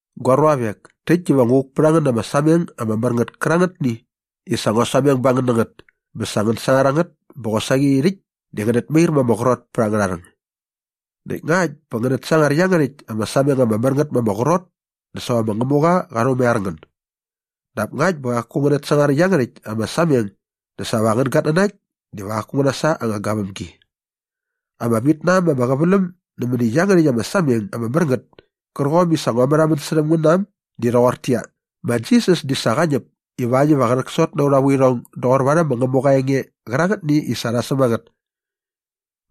Gua ruavek, täkt diva ngu vuk pät a ngän na ama sameng ama mär ngät kärangätni i sa ngua sameng ba ngän na ngät bä sa ngän sangar a ngät bä qosaqi rhäkt di ngänät mair ma ama qrot pät angärha rhäng. Näkt ngakt bä ngänät sangar iangärhäkt ama sameng ama mär ngät ma ama qrot dä sa va ma Ngämuqa qa rhumaiar ngän. Dap ngakt bä qaku ngänät sangar iangärhäkt ama sameng dä sa va angän gatnanakt diva qaku ngä nasa anga gavämgi. Ama vit na äm ama qäväläm nämäni iangärhäkt ama sameng ama mär ngät kärqom i sa ngua märhamän särhäm ngän na äm di rhoqortäqyia, ma Jisas di sa qa ñäp ivakt iva qä rhäksot na aurha vuirhong doqor varhäm ma Ngämuqa aa enge qärangätni i sa rha säm a ngät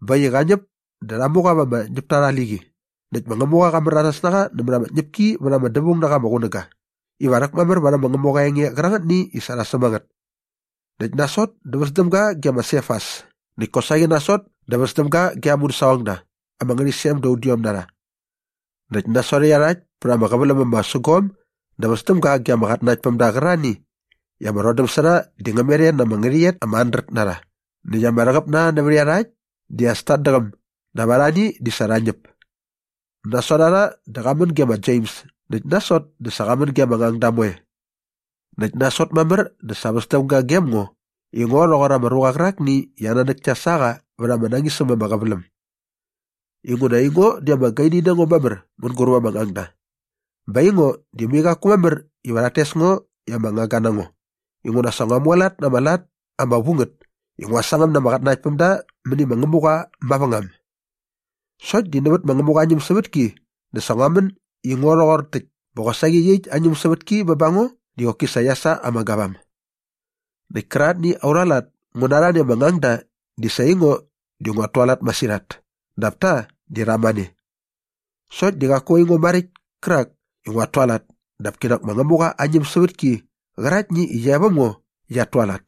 bä äkt i qa ñäp dä rha mu qa mät ama ñäpta arha liqi näkt ma Ngämuqa qa märanas na qa nämät ama tñäpki vät ama dävaung na qa ama qunäga iva rhäkmamär varhäm ma Ngämuqa aa enge qärangätni i sa rha säm a ngät näkt nasot dä väs däm ga ge ma Sefas näkt kosaqi nasot dä väs däm ga ge aa mudäsaqongda ama ngärhäqyisem da udiom na rha. Näkt nasot iarhakt pät ama qäväläm ama sägom dä väs däm ga ge ama qatnanaktpämda qärarhani i ama rhodäm sä rha di ngä met e na ama ngärhäqyet ama handret na rha näkt ama rhäqäp na rha nävät iarhakt di as tat däqäm dap arhani di sa rha ñäp. Nasot a rha dä qa män ge ma Jems näkt nasot dä sa qa män ge ama ngangda moe. Näkt nasot mamär dä sa väs däm ga gem ngo i ngo rhoqor ama ruqa qärakni i aa nanäk kia sa qa vät ama nañis äm ama qäväläm. Inguna aingo di ama gaini na ngo mamär mänguräp ama ngangda bä aingo di mai qaku mamär iva rhat tes ngo i ama ngangga na ngo inguna sa ngua mualat na ama lat ama vu ngät i ngua sangäm na ama qatnanaktpämda mäni ma Ngämuqa mavängam. Sokt di nävät ma Ngämuqa aa ñämsävätki dä sa ngua män i ngo rhoqor täkt bä qosaqi iaqyäkt aa ñämsävätki bä ba ngo di qoki sa qia sa ama gavam. Näkt kärangätni aurha lat ngu na arhani ama ngangda di sa aingo di nguat tualat masirhat dap ta di rha mane. Sokt di qaku aingo maräkt kärak i nguat tualat dap kinak ma Ngämuqa aa ñämsävätki qäraktni i qia e väm ngo qiat tualat.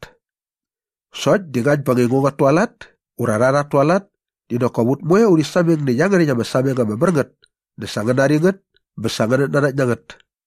Sokt di ngakt bä aingo nguat tualat ura rha rhat tualat di nak kop ut moe di urhi sameng nä iangärhäkt ama sameng ama mär ngät dä sa ngän nari ngät bä sa ngänät nanakt na ngät.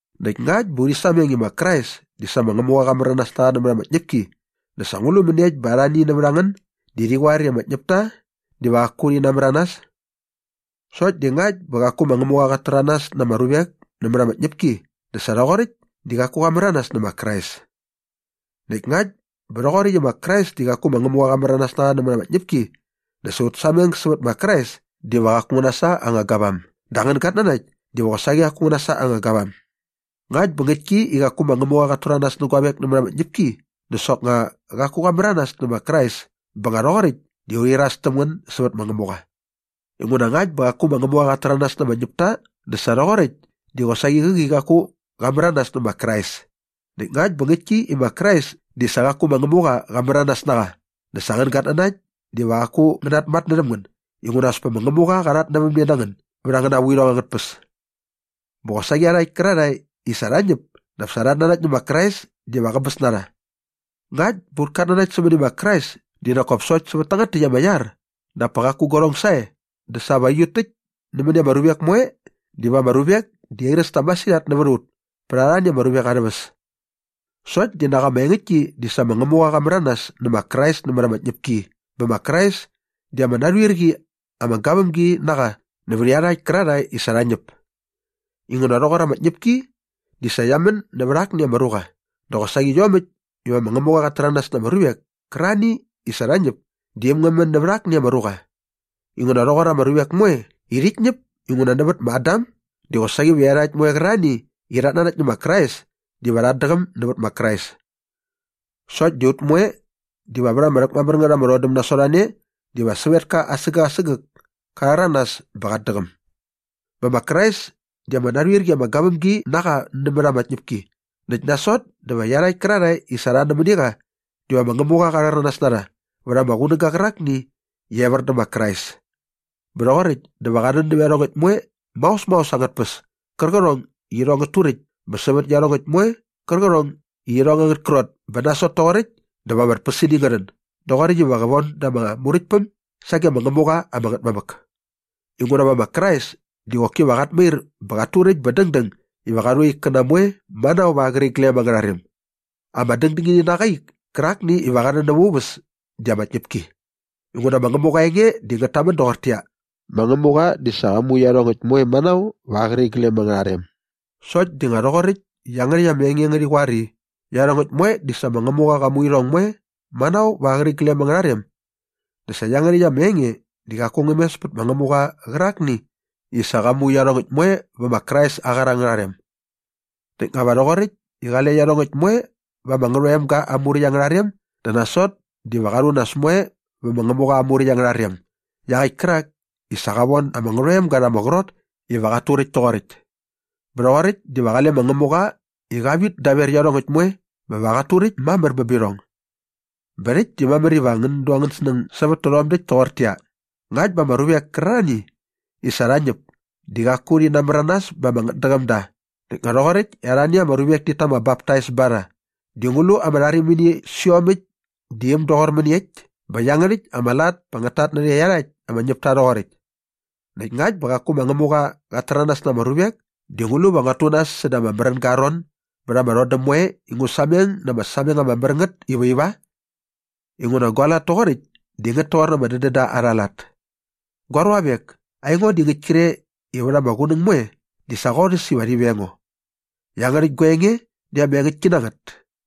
Näkt ngakt bä urhi sameng i ma Krais di sa ma Ngämuqa qa märanas na qa nämät ama tñäpki dä sa ngu lu mäniekt bä arhani nävät a ngän di rhi qoar i ama ñäpta diva qaku rhi namäranas? Sokt di ngakt bä qaku ma Ngämuqa qat täranas na ama ruvek nämät ama tñäpki dä sa rhoqoräkt di qaku qa märanas nä ma Krais. Näkt ngakt bä rhoqoräkt i ma Krais di qaku ma Ngämuqa qa märanas na qa nämät ama tñäpki dä sa aut sameng sävät ma Krais diva qaku ngä nasa anga gavam dä angän gatnanakt diva qosaqi qaku ngä nasa anga gavam. Ngakt bä ngäktki i qaku ma Ngämuqa qat täranas nä guavek nämät ama tñäpki dä soknga qaku qa märanas nä ma Krais bä nga rhoqoräkt di urhi iras täm ngän sävät ma Ngämuqa. Inguna ngakt bä qaku ma Ngämuqa qat täranas na ama ñäpta dä sa rhoqoräkt di qosaqi qäqi qaku qa märanas nä ma Krais. Näkt ngakt bä ngäktki i ma Krais di sa qaku ma Ngämuqa qa märanas na qa dä sa angän gatnanakt diva qaku ngänät namatnärhäm ngän inguna as pa ma Ngämuqa qa rhatnävämne na ngän bät angäna vuirhong angät tpäs. Bä qosaqi iarhakt kärarhae i sa rha ñäp dap sa rhat nanakt nä ma Krais diva qäbäs na rha. Ngakt bä aut katnanakt sämäni ma Krais di nak kop sokt sävät tangät täkt ama iar dap pa qaku guarhong sae dä sa va aiut täkt nämäni ama ruvek moe diva ama ruvek di airäs ta masirhat nävät a ut pät arhani ama ruvek arhä väs. Sokt di nak ama engäktki di sa ma Ngämuqa qa märanas nä ma Krais nämät ama tñäpki bä ma Krais di ama narhuir qi ama gavämgi na qa nävät iarhakt kärarhae i sa rha ñäp. Inguna rhoqor ama tñäpki di sa qia män nävät akni ama ruqa dä qosaqi iomäkt iva ma Ngämuqa qat täranas na ama ruvek kärarhani i sa rha ñäp di äm ngä män nävät akni ama ruqa inguna rhoqor ama ruvek moe i rhit ñäp inguna nävät ma Adam di qosaqi va iarhakt moe qärarhae i rhat nanakt nä ma Krais diva rhat däqäm nävät ma Krais. Sokt di ut moe diva vät ama rhäkmamär ngät ama rhodäm nasot a ne diva sävetka asägäk asägäk ka rhäranas bä qat däqäm. Bä ma Krais di ama narhuir qi ama gavämgi na qa nämät ama tñäpki näkt nasot dä va iarhakt kärarhae i sa rha nämäni qa diva ma Ngämuqa qa rhäranas na rha vät ama qunäga qärakni iva evär dä ma Krais. Bä rhoqoräkt dä va qa rhän nävä iarhongäkt moe maos maos angät tpäs kärqärhong i irhong ngät turäkt bä sävät iarhongäkt moe kärqärhong i irhong angät krot bä nasot toqoräkt dä va ama tpäsini ngä rhän doqoräkt iva qä von da ama Muräktpäm sage ma Ngämuqa ama Ngätmamäk. Inguna va ma Krais di qoki va qat mair bä qat turäkt bä dängdäng iva qa rhu aa ikkäna moe manao va aa qäriglem angärha rem. Ama dängdängini na qa aa ik kärakni iva qa rhän näva aa uväs di ama tñäpki. Inguna ma Ngämuqa aa enge di ngät tamän doqortäqyia, “Ma Ngämuqa di sa qa mu iarhongäkt moe manao va aa qäriglem angärha rem.” Sokt di nga rhoqoräkt i iangärhäkt ama enge ngärhi qoar i, “Iarhongäkt moe di sa ma Ngämuqa qa mu irhong moe manao va aa qäriglem angärha rem” dä sa iangärhäkt ama enge di qaku ngä mes pät ma Ngämuqa qärakni i sa qa mu iarhongäkt moe vä ma Krais aa qar angärha rem. Näkt nga va rhoqoräkt i qale iarhongäkt moe va ama Ngärhoemga aa muräkt angärha rem dä nasot diva qa rhu nas moe vä ma Ngämuqa aa muräkt angärha rem iaqäkt kärak i sa qa von ama Ngärhoemga rha ama qrot iva qat turäkt toqoräkt. Bä rhoqoräkt diva qale ma Ngämuqa i qa vit daver iarhongäkt moe bä va qat turäkt mamär bä bä irhong. Bä rhäkt di mamär iva ngän du angän snäng sävät tärhom däkt toqortäqyia, ngakt bä ama ruvek kärarhani i sa rha ñäp di qaku rhi namäranas bä ama ngätdäqäm da näkt nga rhoqoräkt i arhani ama ruvek tit ta ama baptais ba rha di ngu lu ama rharimini sä iomäkt di äm doqor mäniekt bä iangärhäkt ama lat pa ngät tatnärhä iarhakt ama ñäpta rhoqoräkt? Näkt ngakt bä qaku ma Ngämuqa qat täranas na ama ruvek di ngu lu va nguat tu nas säda ama märänga aa ron bät ama rhodäm moe i ngu sameng na ama sameng ama mär ngät iva iva? Inguna gua lat toqoräkt di ngät toqor ama dädända arha lat. Gua ruavek, aingo di ngäkt kre i vät ama qunäng moe di sa qorhäs iva rhi veng ngo. Iangärhäkt gua enge di ama engäktki na ngät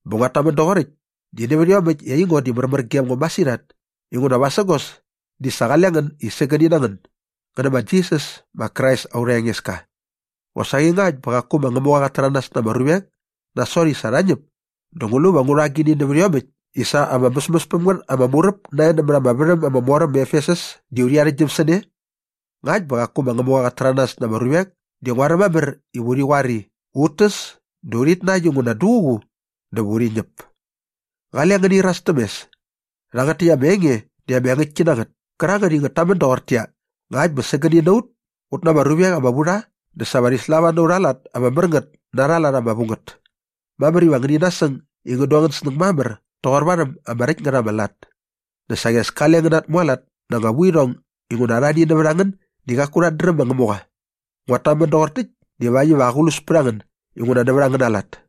bä nguat tamän doqoräkt di nävät iomäkt i aingo di märmär gem ngo masirhat inguna vasägos di sa qale ngän i sägäni na ngän ngän nä ma Jisas ma Krais aurha Engeska. Qosaqi ngakt bä qaku ma Ngämuqa qat täranas na ama ruvek nasot i sa rha ñäp dä ngu lu va ngu rha agini nävät iomäkt i sa ama mäsmäs päm ngät ama muräp nae nämät ama värhäm ama mor äm ma Efesus di urhi arhäktgyäm sä ne? Ngakt bä qaku ma Ngämuqa qat täranas na ama ruvek di nguaräm mamär iva urhi qoar i, “Ut täs dä urhit nakt inguna duququ dä va urhi ñäp.” Qale ngäni iras täm mes. Rhangät täkt ama enge di ama engäktki na ngät kärangät i ngät tamän doqortäqyia, “Ngakt bä sägäni na ut ut na ama ruvek ama vu rha dä sa va rhi slava na aurha lat ama mär ngät na arha lat ama vu ngät.” Mamär iva ngäni nasäng i ngän du angän snäng mamär toqor varhäm ama räkt ngät ama lat. Dä saqi as kale ngän natmualat na anga vuirhong inguna arhani nävät a ngän di qaku rhat dräm ma Ngämuqa. Nguat tamän doqor täkt divakt iva aqlus pät a ngän inguna nävät angäna lat.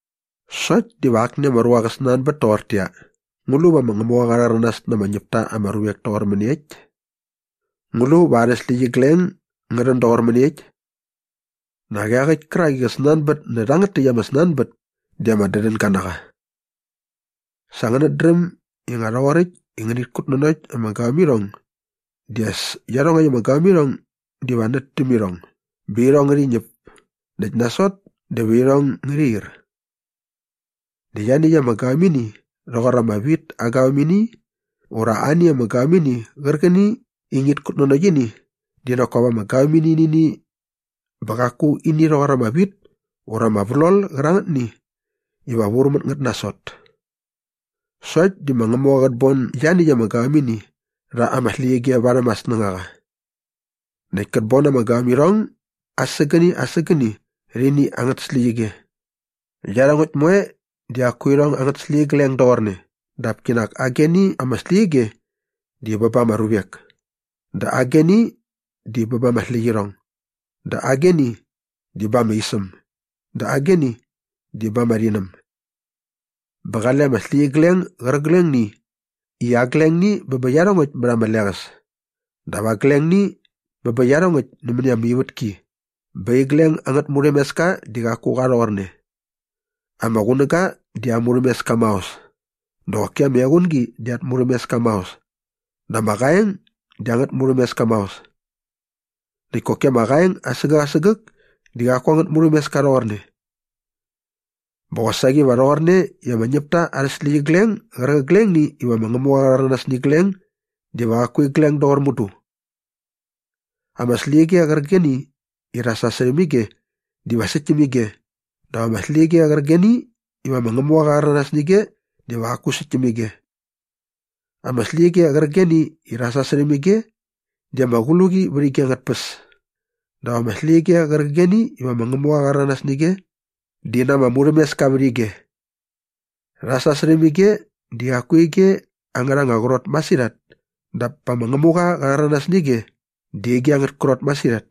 Sokt diva akni ama ruqa qä snanbät toqortäqyia, “Ngu lu va ma Ngämuqa qa rhäranas na ama ñäp ta ama ruvek toqor mäniekt? Ngu lu va arhä släqyigleng ngä rhän doqor mäniekt?” Nak iaqäkt kärak i qä snanbät nä rhangät täkt ama snanbät di ama dädänga na qa. Sa ngänät dräm i nga rhoqoräkt i ngänit kutnanokt ama gavämirhong di as iarhongäkt ama gavämirhong diva nät däm irhong bä irhong ngärhi ñäp näkt nasot dä va irhong ngärhi ir. Dä ianiäkt ama gavämini rhoqor ama wit aa gavämini ura ani ama gavämini qärqäni i ngit kutnanokt ini di nak kop ama gavämini nä ini bä qaku ini rhoqor ama wit ura ama vlol qärangätni iva vur mät ngät nasot. Sokt di ma Ngämuqa qät bon ianiäkt ama gavämini rha ama släqyige varhäm aa snängaqa. Näkt kät bon ama gavämirhong asägäni asägäni rhä ini angät släqyige. Iarhongäkt moe di qaku irhong angät släqyigleng doqorne dap kinak ageni ama släqyige di bä ba ama ruvek dä ageni di bä ba ama släqyirhong dä ageni di ba ama isäm dä ageni di ba ama rhinäm. Bä qale ama släqyigleng gärqiglengni i aglengni bä bä iarhongäkt mät ama leqäs dap aglengni bä bä iarhongäkt nämäni ama ivätki bä igleng angät murhämeska di qaku qa rhoqorne. Ama qunäga di aa murhämeska maos dä qoki ama equngi di at murhämeska maos dä ama qaeng di angät murhämeska maos. Näkt koki ama qaeng asägäk asägäk di qaku angät murhämeska rhoqorne. Bä qosaqi va rhoqorne i ama ñäpta arhä släqyigleng gärqiglengni iva ma Ngämuqa qa rhäranas nä igleng diva qaku igleng doqor mudu. Ama släqyige qärqigeni i rha sasärhäm ige diva säkt täm ige dap ama släqyige qärqigeni iva ma Ngämuqa qa rhäranas nä ige diva qaku säkt täm ige. Ama släqyige qärqigeni i rha sasärhäm ige di ama qluqi vät ige angät tpäs dap ama släqyige qärqigeni iva ma Ngämuqa qa rhäranas nä ige di na ama murhämeska vät ige. Rha sasärhäm ige di qaku ige angärha anga qrot masirhat dap pa ma Ngämuqa qa rhäranas nä ige di ige angät krot masirhat.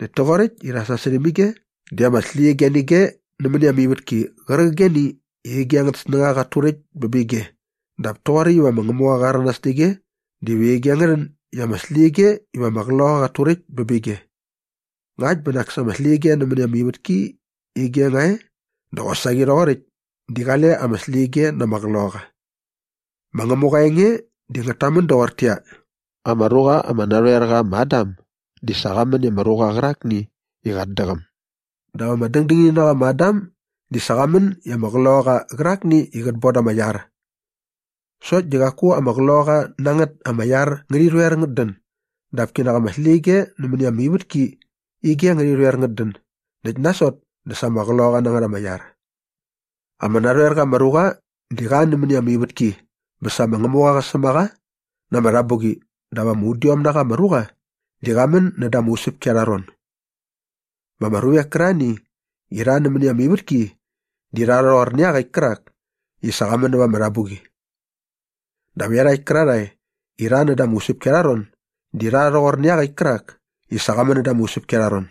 Näkt toqoräkt i rha sasärhäm ige di ama släqyige nä ige nämäni ama ivätki qärqigeni i ige angät snängaqa qat turäkt bä bä ige dap toqoräkt iva ma Ngämuqa qa rhäranas nä ige dä va ige ngä rhän i ama släqyige iva ama qloqaqa qat turäkt bä bä ige. Ngakt bä nak sa ama släqyige nämäni ama ivätki ige nga e dä qosaqi rhoqoräkt di qale ama släqyige na ama qloqaqa. Ma Ngämuqa aa enge di ngät tamän doqortäqyia, “Ama ruqa ama narhoer qa ma Adam di sa qa män i ama ruqa qärakni i qat däqäm” dap ama dängdängini na qa ma Adam di sa qa män i ama qloqaqa qärakni i qät bon da ama iar. Sokt di qaku ama qloqaqa na ngät ama iar ngärhi rhoer ngät dän dap kinak ama släqyige nämäni ama ivätki ige ngärhi rhoer ngät dän näkt nasot dä sa sa ama qloqaqa na ngät ama iar. Ama narhoer qa ama ruqa di qa nämäni ama ivätki bä sa ma Ngämuqa qa säm a qa na ama rhabuqi dap ama udiom na qa ama ruqa di qa män näda ama usäpki arha ron. Bä ama ruvek kärarhani i rha nämäni ama ivätki di rha rhoqor iaqäkt kärak i sa qa män näva ama rhabuqi. Dap iarhakt kärarhae i rha näda ama usäpki arha ron di rha rhoqor iaqäkt kärak i sa qa män näda ama usäpki arha ron.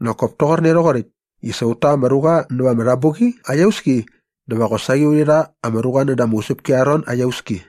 Nak kop toqorne rhoqoräkt i sa ut ta ama ruqa näva ama rhabuqi aa iauski dä va qosaqi urhi rha ama ruqa näda ama usäpki arha ron aa iauski.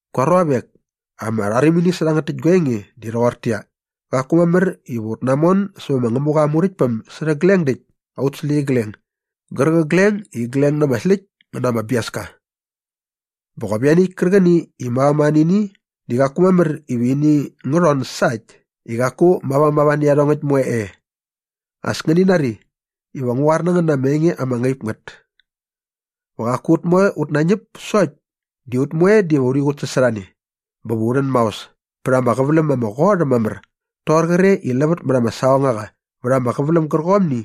Gua ruavek, ama rharimini sä rhangät täkt gua enge di rhoqortäqyia, qaku mamär iva ut namon sävä ma Ngämuqa aa Muräktpäm sä rhägleng däkt aut släqyigleng gärqigleng i igleng na ama släkt ngä na ama biaska. Bä qop ianiäkt kärqäni i mavamava nä ini di qaku mamär iva ini ngä rhon sa äkt i qaku mavamava nä iarhongäkt moe e. As ngäni nari iva ngu qoar na ngän na ama enge ama ngaip ngät. Va qaku ut moe ut nañäp sokt di ut moe diva urhi qutsasorhane bä va u rhän maos pät ama qäväläm ama qot äm mamär toqor qre i lävät mät ama saqongaqa vät ama qäväläm gärqomni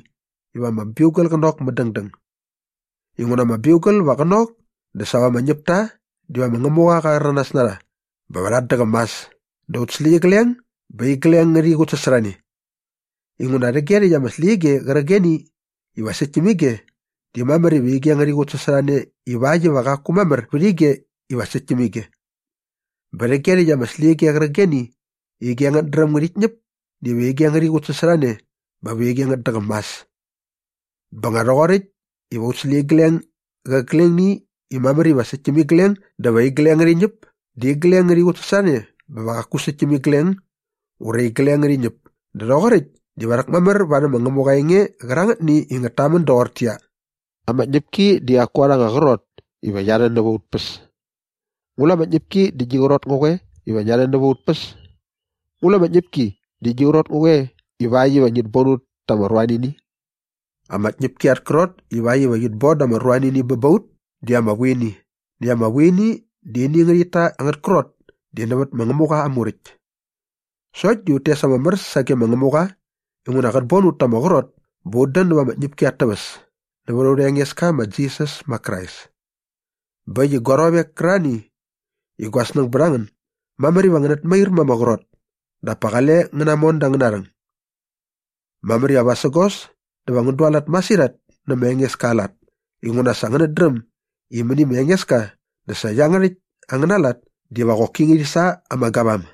iva ama biugal qä nok mädängdäng. Inguna ama biugal va qä nok dä sa va ama ñäpta diva ma Ngämuqa qa rhäranas na rha bä va rhat däqäm mas dä aut släqyigleng ba igleng ngärhi qutsasorhane. Inguna rhäge rhäkt ama släqyige qärqigeni iva säkt täm ige di mamär iva ige ngärhi qutsasorhane ivakt iva qaku mamär vät ige iva säkt täm ige. Bä rhäge rhäkt ama släqyige qärqigeni i ige ngät dräm ngärhit ñäp diva ige ngärhi qutsasorhane bä va ige ngät däqäm mas. Bä nga rhoqoräkt iva aut släqyigleng gärqiglengni i mamär iva säkt täm igleng dä va igleng ngärhi ñäp di igleng ngärhi qutsasorhane bä va qaku säkt täm igleng ura igleng ngärhi ñäp dä rhoqoräkt diva rhäkmamär varhäm ma Ngämuqa aa enge qärangätni i ngät tamän doqortäqyia, “Ama tñäpki di qaku arha anga qrot iva qia rhän näva aut päs.” “Ngu lu ama tñäpki di gi qrot ngä qoe iva ngia rhän näva aut päs? Ngu lu ama tñäpki di gi qrot ngä qoe ivakt iva ngit bon ut ta ama ruanini?” Ama tñäpki at krot ivakt iva qit bon da ama ruanini bä ba ut di ama vuini näkt ama vuini di ini ngärhit ta angät krot di nävät ma Ngämuqa aa Muräkt. Sokt di ut tes ama mär sage ma Ngämuqa inguna qät bon ut ta ama qrot bä ut dän näva ama tñäpki at täväs nävät aurha Engeska ma Jisas ma Krais. Bä äkt i gua ruavek kärarhani i gua snäng bät a ngän, mamär iva ngänät mair ma ama qrot dap pa qale ngän namon da angäna rhäng. Mamär iva vasägos dä va ngän dualat masirhat nä ma Engeska aa lat inguna sa ngänät dräm i mäni ma Engeska dä sa iangärhäkt angäna lat diva qoki ngärhi sa ama gavam.